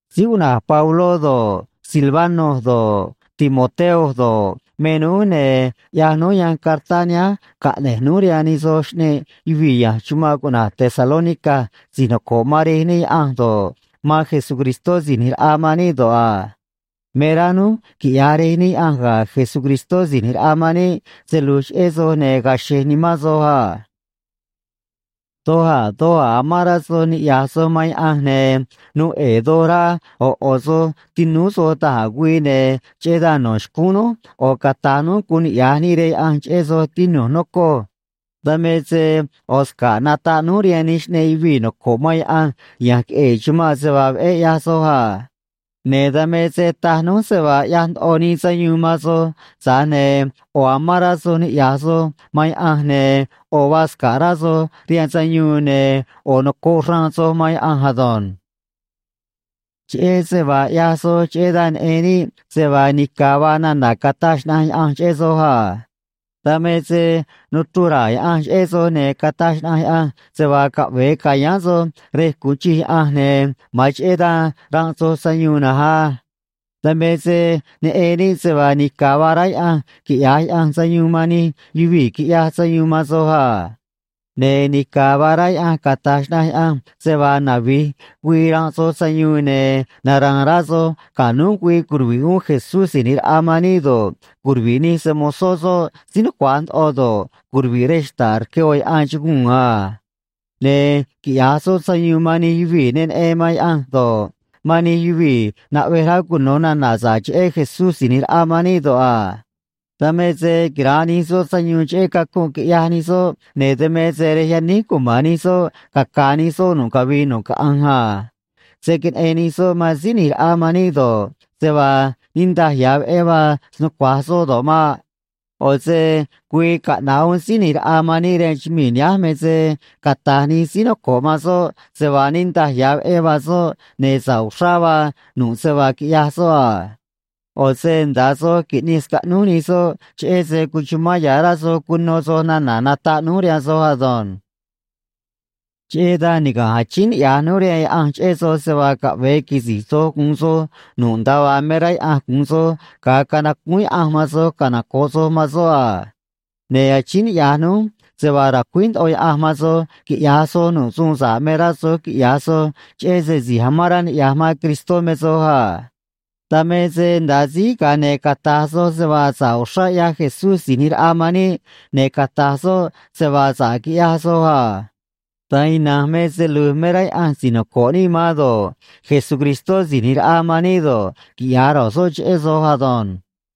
Síí cuꞌna̱j Pabló do̱ꞌ, Silvano do̱ꞌ, Timoteo do̱ꞌ, me núj, ne̱ ꞌyaj núj yanj cartá nihánj caꞌne̱j núj rihaan nij soj xꞌneꞌ yuvii̱ ya̱nj chumanꞌ cuꞌna̱j Tesalónica si̱j noco̱ꞌ man Rej níꞌ Yaꞌanj do̱ꞌ, man Jesucristó Si̱j ꞌNi̱j Raꞌa man níꞌ do̱ꞌ a. Me rá núj quiꞌya̱j Rej níꞌ Yaꞌanj ga̱ Jesucristó Si̱j ꞌNi̱j Raꞌa man níꞌ se lu̱j cheꞌé soj, ne̱ ga̱a̱ xe̱j nimán soj a. Doj a̱ doj a̱ amán rá soj niꞌya̱j soj man Yaꞌanj, ne̱ nuu ꞌe̱e̱ doj rá ꞌo̱ ꞌo̱ soj tinúú soj da̱j a̱ güii, ne̱ cheꞌé dan no̱ xcúún núj ꞌo̱ cata̱j núj guun niꞌya̱j níꞌ rihaan Yaꞌanj cheꞌé soj, tinu̱j, nocoj. Dan me se ꞌo̱ sca̱ꞌ nataꞌ núj rihaan nij xꞌneꞌ yuvii̱ noco̱ꞌ man Yaꞌanj ya̱nj queꞌe̱e̱ chumanꞌ se vaa veꞌé ꞌyaj soj a. Ne̱ dan me se taj núj se vaa ꞌyaj ndoꞌo nii sayuun man soj, tza̱j ne̱ ꞌo̱ amán rá soj niꞌya̱j soj man Yaꞌanj, ne̱ ꞌo̱ vaa sca̱ꞌ rá soj rihaan sayuun, ne̱ ꞌo̱ nocoꞌ xraan soj man Yaꞌanj ado̱nj. Cheꞌé se vaa ꞌyaj soj, cheꞌé dan neꞌen níꞌ se vaa nica̱ vaa nana̱ cataj xnaꞌanj Yaꞌanj cheꞌé soj a. Dan me se nuchruj ra̱a̱ Yaꞌanj cheꞌé soj, ne̱ cataj xnaꞌanj Yaꞌanj se vaa caꞌve̱e ca̱yáán soj rej gu̱un chij Yaꞌanj, ne̱ ma̱an cheꞌé dan ranꞌ soj sayuun na̱nj á. Dan me se neꞌen níꞌ se vaa nica̱ vaa rá Yaꞌanj quiꞌya̱j Yaꞌanj sayuun man nij yuvii̱ quiꞌyaj sayuun man soj a. Ne̱ nica̱ vaa rá Yaꞌanj cata̱j xnaꞌanj Yaꞌanj se vaa navi̱j güii ranꞌ soj sayuun, ne̱ nara̱a̱n rá soj ga̱ núj güii curuvi̱ꞌ uún Jesús Si̱j ꞌNi̱j Raꞌa man níꞌ do̱ꞌ, curuvi̱ꞌ nij se‑mo̱zó soꞌ síí nucua̱j ndoꞌo do̱ꞌ, curuvi̱ꞌ rej xta̱ꞌ rque ꞌo̱ yaꞌan chuguu̱n a. Ne̱ quiꞌya̱j soꞌ sayuun man nij yuvii̱ ne neꞌen man Yaꞌanj do̱ꞌ, man nij yuvii̱ naꞌvej rá cuno̱ nana̱ sa̱ꞌ cheꞌé Jesús Si̱j ꞌNi̱j Raꞌa man níꞌ do̱ꞌ a. Dan me se quira̱nꞌ nij soꞌ sayuun cheꞌé cacunꞌ quiꞌyaj nij soꞌ, ne̱ dan me se rej yaníj cuma̱n nij soꞌ, caca̱a̱ nij soꞌ nu̱ꞌ cavii nu̱ꞌ caꞌanj a. Se̱ queneꞌen nij soꞌ man Síí ꞌNi̱j Raꞌa man níꞌ do̱ꞌ, se vaa niꞌndaj ya̱ veꞌé vaa snucua̱j soꞌ do̱ꞌ maꞌ. ꞌO̱ se güii caꞌna̱ꞌ uún Síí ꞌNi̱j Raꞌa man níꞌ rihaan chumii̱ nihánj me se cata̱j nij síí noco̱ꞌ man soꞌ se vaa niꞌndaj ya̱ veꞌé vaa soꞌ, ne̱ sa̱ꞌ uxrá vaa nu̱ꞌ se vaa quiꞌyaj soꞌ a. ꞌO̱ se nda̱a soj qui̱ꞌnij scaꞌnúj nij soꞌ cheꞌé se cuchumán ya̱ rá soj cuno soj nana̱ nataꞌ núj rihaan soj ado̱nj. Cheꞌé dan niga̱nj achíín niꞌya̱j núj rihaan Yaꞌanj cheꞌé soj se vaa caꞌve̱e quisi̱j soj gu̱un soj nu̱ꞌ nda̱a vaa me rá Yaꞌanj gu̱un soj ga̱a canacúún Yaꞌanj man soj canoco̱ꞌ soj man soꞌ a. Ne̱ achíín niꞌya̱j núj se vaa ra̱cuíj ndoꞌo Yaꞌanj man soj quiꞌya̱j soj nu̱ꞌ suun sa̱ꞌ me rá soj quiꞌya̱j soj, cheꞌé se si̱j amán rá niꞌya̱j man Cristó me soj a. Dan me se nda̱a síj, ga̱a ne̱ cata̱j soj se vaa sa̱ꞌ uxrá ꞌyaj Jesús Si̱j ꞌNi̱j Raꞌa man níꞌ, ne̱ cata̱j soꞌ se vaa sa̱ꞌ quiꞌyaj soj a. Da̱nj ina̱nj me se lu̱j me rá Yaꞌanj si̱j noco̱ꞌ níꞌ man do̱ꞌ, Jesucristó Si̱j ꞌNi̱j Raꞌa man níꞌ do̱ꞌ, quiꞌya̱j ro̱j soꞌ cheꞌé soj ado̱nj.